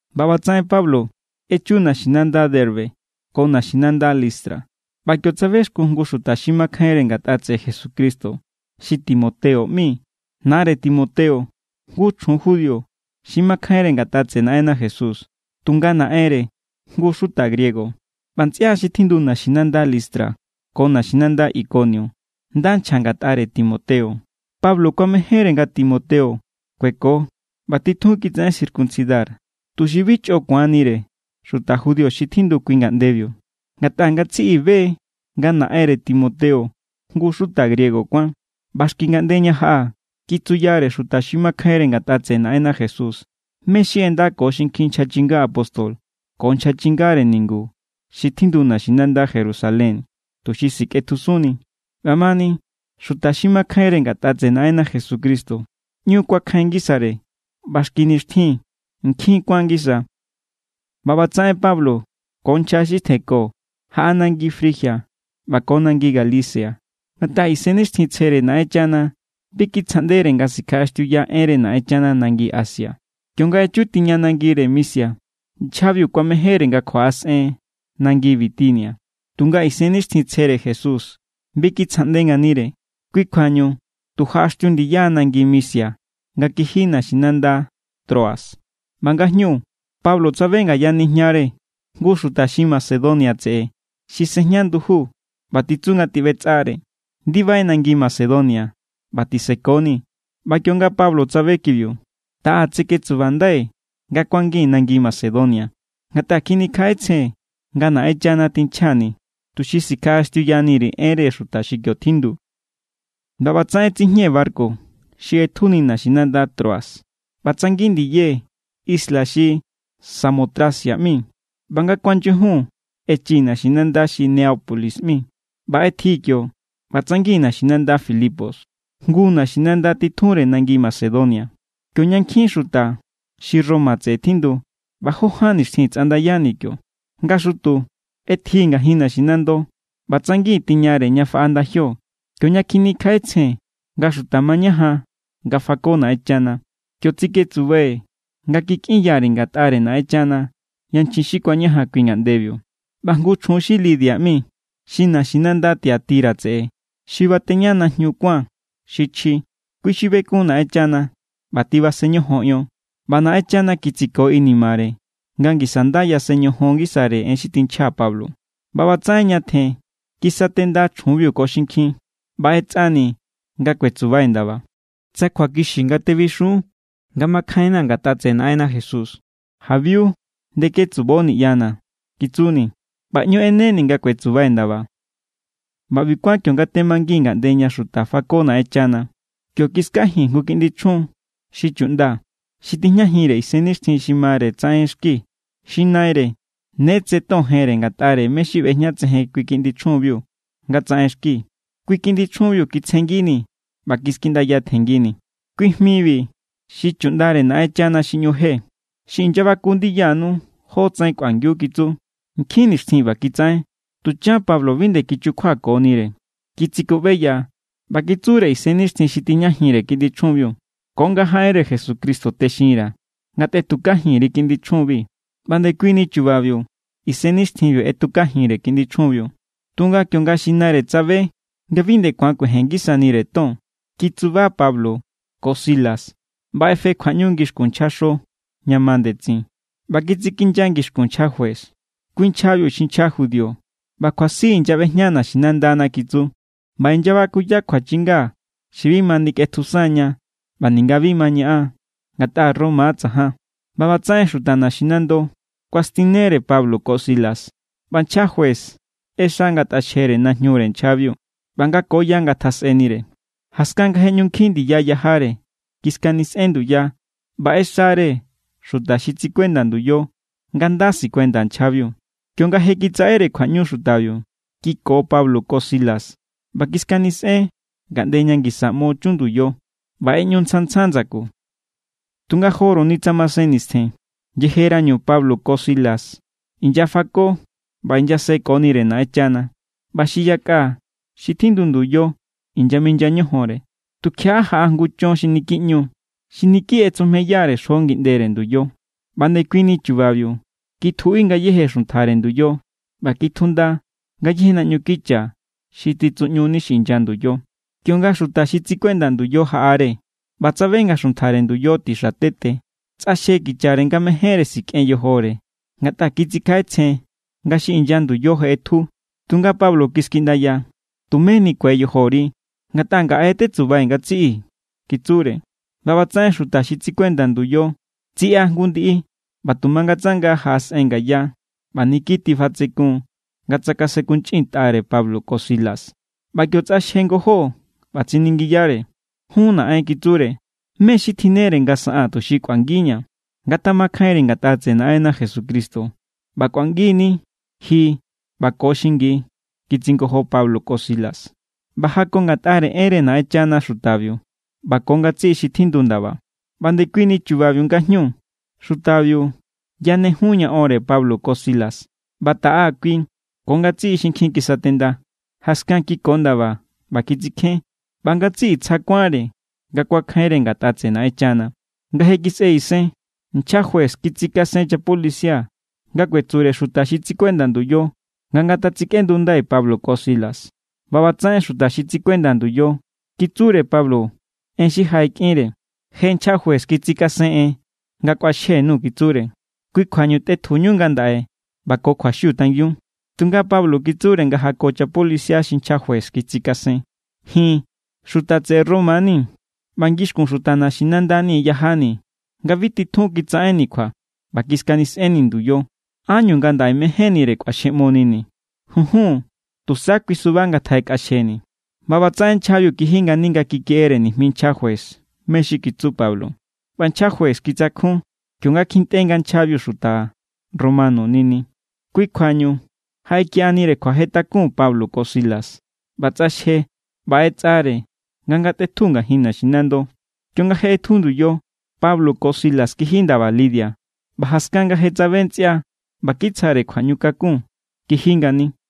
ꞌBa ꞌbatsaꞌen Pablo echu naxinanda Derbe ko naxinanda Listra. ꞌBa kio tsabexkun jngu xuta xi makjainre ngatꞌa tseꞌe Jesucristo xi Timoteo ꞌmi. Nare Timoteo jngu chjun judío xi makjainre ngatꞌa tseꞌe Naꞌenna Jesús, tunga naꞌenre jngu xuta griego. ꞌBa ntsꞌia xi tjindu naxinanda Listra ko naxinanda Ikonio nda nchja ngatꞌare Timoteo. Pablo kuamejénre nga Timoteo kueko ꞌba titjun kitsaꞌen circuncidar, tuxi bi chꞌo ku̱anire xuta judío xi tjindu kui ngaꞌndebiu. Ngatꞌa ngatsiꞌi be= nga naꞌenre Timoteo jngu xuta griego kuán. ꞌBa xki ngaꞌnde ña jaꞌa, kitsuyare xuta xi makjainre ngatꞌa tseꞌe Naꞌenna Jesús mé= xi ꞌenda ko xinkjin nchja chinga apóstol ko nchja chingare ningu xi tjindu naxinanda Jerusalén, tuxi sikꞌetjusunni. ꞌBamani, xuta xi makjainre ngatꞌa tseꞌe Naꞌenna Jesucristo ꞌñu kuakjain ngisare ꞌba xki nixtjin nkjin kuan ngisa. ꞌBa ꞌbatsaꞌen Pablo ko nchja xi tjenko jaꞌa nangi Frigia ꞌba ko nangi Galacia, ngatꞌa Isennixtjintsjere Naꞌenchana bi kitsjaꞌndere nga sikjaꞌaxtiuya enre Naꞌenchana nangi Asia. Kionga echu tiñare nangi Misia, nchjabiu kuamejénre nga kjuaꞌasꞌen nangi Bitinia, tunga Isennixtjintsjere Jesús bi kitsjaꞌnde nganire. Kui kjuañu tu jaꞌaxtiu ndiya nangi Misia nga kiji naxinanda Troas. ꞌBa ngajñu, Pablo tsabe ngaya nijñare jngu xuta xi Macedonia tseꞌe xi sejña nduju ꞌba titsu nga tiꞌbetsꞌare: “Ndibai nangi Macedonia ꞌba tisekonii̱.” ꞌBa kionga Pablo tsabe kibiu, taꞌa tseketsubandai̱ nga kuangii̱n nangi Macedonia. Ngatꞌa kjinikjaꞌetsjee̱n nga Naꞌenchana tinchjani̱ tuxi sikjaꞌaxtiuyani_ri̱ enre xuta xi kio tjindu. ꞌBa ꞌbatsaꞌen tsijñee̱ barku xi ꞌetju naxinanda Troas, ꞌba tsangin ndiyee̱ isla xi Samotracia ꞌmi, ꞌba nga kuanyujun, echii̱ naxinanda xi Neápolis ꞌmi. ꞌBa ꞌetjii̱ kio ꞌba tsangi̱n naxinanda Filipos, jngu naxinanda titjunre nangi Macedonia, kioña nkjin xuta xi Roma tseꞌe tjindu. ꞌBa jó ján nixtjin tsꞌandayani̱ kio. Nga xutu ꞌetjii̱ ngajin naxinando ꞌba tsangi̱n tiñare ña faꞌa ndajio, kioña kjinikjaꞌetsjee̱n nga xuta mañajan nga fako Naꞌenchana. Kio tsiketsubai̱ nga kikꞌinya_ri̱ ngatꞌare Naꞌenchana yanchjin xi kuañajan kui ngaꞌndebiu. ꞌBa jngu chjun xi Lidia ꞌmi, xi naxinanda Tiatira tseꞌe xi bateña najñu kuán xi chji, kui xi bekun Naꞌenchana ꞌba tibasen ñojon ion. ꞌBa Naꞌenchana kitsiko inimare nga ngisa nda yasen ñojon ngisare en xi tinchja Pablo. ꞌBa ꞌbatsaꞌen ñatjen kisatenda chjunbiu ko xinkjin, ꞌba ꞌetsꞌani̱ nga kuetsubai̱ ndaba. —Tsa kjuakixi nga tebixun nga makjainna̱ ngatꞌa tseꞌe Naꞌenna Jesús, jabiu ndeketsubo niꞌyana̱ —kitsuni̱ ꞌba ꞌñu ꞌeneni̱ nga kuetsubai̱ ndaba. ꞌBa ꞌbi kuán, kionga temangii̱n ngaꞌnde ña xuta fako Naꞌenchana, kio kiskajii̱n jngu kiꞌndi chjun xi chuꞌnda xi tijñajinre isennixtjin xi mare tsaꞌenxki. Xi naire ne tse ton jenre ngatꞌare mé= xi ꞌbejñatsejen kui kiꞌndi chjunbiu nga tsaꞌenxki. Kui kiꞌndi chjunbiu kitsjenngini̱ ꞌba kiskiꞌndaya tjenngini̱: —Kui jmibi xi chuꞌndare Naꞌenchana xi ꞌñu je, xi inyabaku ndiyanu jótsaꞌen kꞌuangiu —kitsu. Nkjin nixtjin ꞌba kitsaꞌen. Tuchan Pablo bi nde kichukjuakonire. Kitsikuꞌbeya ꞌba kitsure isennixtjin xi tijñajinre kiꞌndi chjunbiu: —Ko nga jaꞌenre Jesucristo texinra̱ nga tꞌetukajin_ri kiꞌndi chjunbi. ꞌBa ndekuini chubabiu isennixtjinbiu ꞌetukajinre kiꞌndi chjunbiu. Tunga kionga xi naire tsabe nga bi nde ku̱an kuejen ngisanire ton, kitsuba Pablo ko Silas ꞌba ꞌefe kjuaꞌñu ngixkun nchjaxo ña ma ndetsin. ꞌBa kitsikinya ngixkun nchja juez. —Kui nchjabi xi nchja judío ꞌba kjuasi inyaꞌbejña naxinandana —kitsu—. ꞌBa inyabakuya kjuachinga xi bi ma nikꞌetjusan ña ꞌba ninga bi ma ñaꞌan, ngatꞌa Roma= tsajan. ꞌBa ꞌbatsaꞌen xuta naxinando kuastinere Pablo ko Silas, ꞌba nchja juez ꞌexa nga ngatꞌaxjere najñure nchjabiu ꞌba nga ko ya ngatjasꞌenire. Jaskan nga je ꞌñu nkjin ndiya yajare, kiskanisꞌen nduya ꞌba ꞌexare xuta xi tsikuenda nduyo nga nda sikuenda nchjabiu. Kionga je kitsaꞌere kjuaꞌñu xutabiu, kiko Pablo ko Silas ꞌba kiskanisꞌen ngaꞌnde ña ngisa ꞌmo chun nduyo, ꞌba ꞌeꞌñu tsjan tsjan ndsaku. Tunga joruni tsa masen nistjen, yejerañu Pablo ko Silas inyafako ꞌba inyasekonire Naꞌenchana, ꞌba xi yakꞌa xi tjindu nduyo inyaminya ñojonre, tukjiaꞌa jaꞌa jngu chon xi niki ꞌñu=, xi niki ꞌetsujmeyare xjo ngindere nduyo. ꞌBa ndekuini chubabiu kitjuꞌi ngayéje xuntjare nduyo, ꞌba kitjunda ngayéje naꞌñu kicha xi titsuꞌñuni xi inya nduyo. Kionga xuta xi tsikuenda nduyo jaꞌare ꞌba tsabe nga xuntjare nduyo tixa tete, tsꞌaxje kichare nga mejénre sikꞌen yojore, ngatꞌa kitsikjaꞌetsjen nga xi inya nduyo je ꞌetju. Tunga Pablo kiskiꞌndaya: —Tumé nikue yojori, ngatꞌa ngaꞌe= tetsubai̱ ngatsiꞌi —kitsure. ꞌBa ꞌbatsaꞌen xuta xi tsikuenda nduyo tsiꞌa jngu ndiꞌi ꞌba tu mangatsanga jaꞌasꞌen ngaya ꞌba niki tifatsekun= nga tsakasenkunchꞌintꞌare Pablo ko Silas. ꞌBa kio tsꞌaxje ngojó ꞌba tsiningiyare: —Jun naꞌen —kitsure—, ¿mé= xi tjinnere nga saꞌaa̱n tuxi kꞌuangiña̱? —Ngatamakjainri ngatꞌa tseꞌe Naꞌenna Jesucristo, ꞌba kꞌuangi=ni ji ꞌba ko xingi —kitsingojo Pablo ko Silas. ꞌBa jako ngatꞌare enre Naꞌenchana xutabiu ꞌba ko ngatsiꞌi xi tjindu ndaba. ꞌBa ndekuini chubabiu ngajñu, xutabiu yanejun ña onre Pablo ko Silas, ꞌba taꞌa kui ko ngatsiꞌi xinkjin kisatenda. Jaskan kiko ndaba ꞌba kitsikjén, ꞌba ngatsiꞌi tsja kuánre nga kuakjainre ngatꞌa tseꞌe Naꞌenchana. Nga je kisꞌe isen, nchja juez kitsikasen chapolicia nga kuetsure xuta xi tsikuenda nduyo nga ngatasikꞌendundai Pablo ko Silas. ꞌBa ꞌbatsaꞌen xuta xi tsikuenda nduyo kitsure Pablo en xi jaꞌekꞌinre: —Je nchja juez kitsikasen en nga kꞌuaxjenu —kitsure—. Kui kjuañu tꞌetjuñu ngandaꞌe ꞌba ko kjuaxiu tangiun. Tunga Pablo kitsure nga jako chapolicia xi nchja juez kitsikasen: —Ji̱n xuta tseꞌe Roma ni, ꞌba ngixkun xuta naxinanda yajani̱ nga bi titjun kitsaꞌenni̱ kjua, ꞌba kiskanisꞌenni̱ nduyo. ¿Ánñu ngandaꞌe mejénnire kꞌuaxjeꞌmonini̱? ¡Junjun! Tusa kui suba ngatjaꞌekꞌaxjeni̱. ꞌBa ꞌbatsaꞌen nchjabiu kiji ngani nga kikeꞌere nijmi nchja juez mé= xi kitsu Pablo, ꞌba nchja juez kitsakjun kionga kjintꞌe nga nchjabiu xuta romano= nini. Kui kjuañu jaꞌekiꞌanire kjuajetakun Pablo ko Silas, ꞌba tsꞌaxje ꞌba ꞌetsꞌare nga ngatꞌetju ngajin naxinando. Kionga je ꞌetju nduyo, Pablo ko Silas kiji ndaba Lidia. ꞌBa jaskan nga je tsabe ntsꞌia ꞌba kitsjare kjuaꞌñukakun, kiji ngani.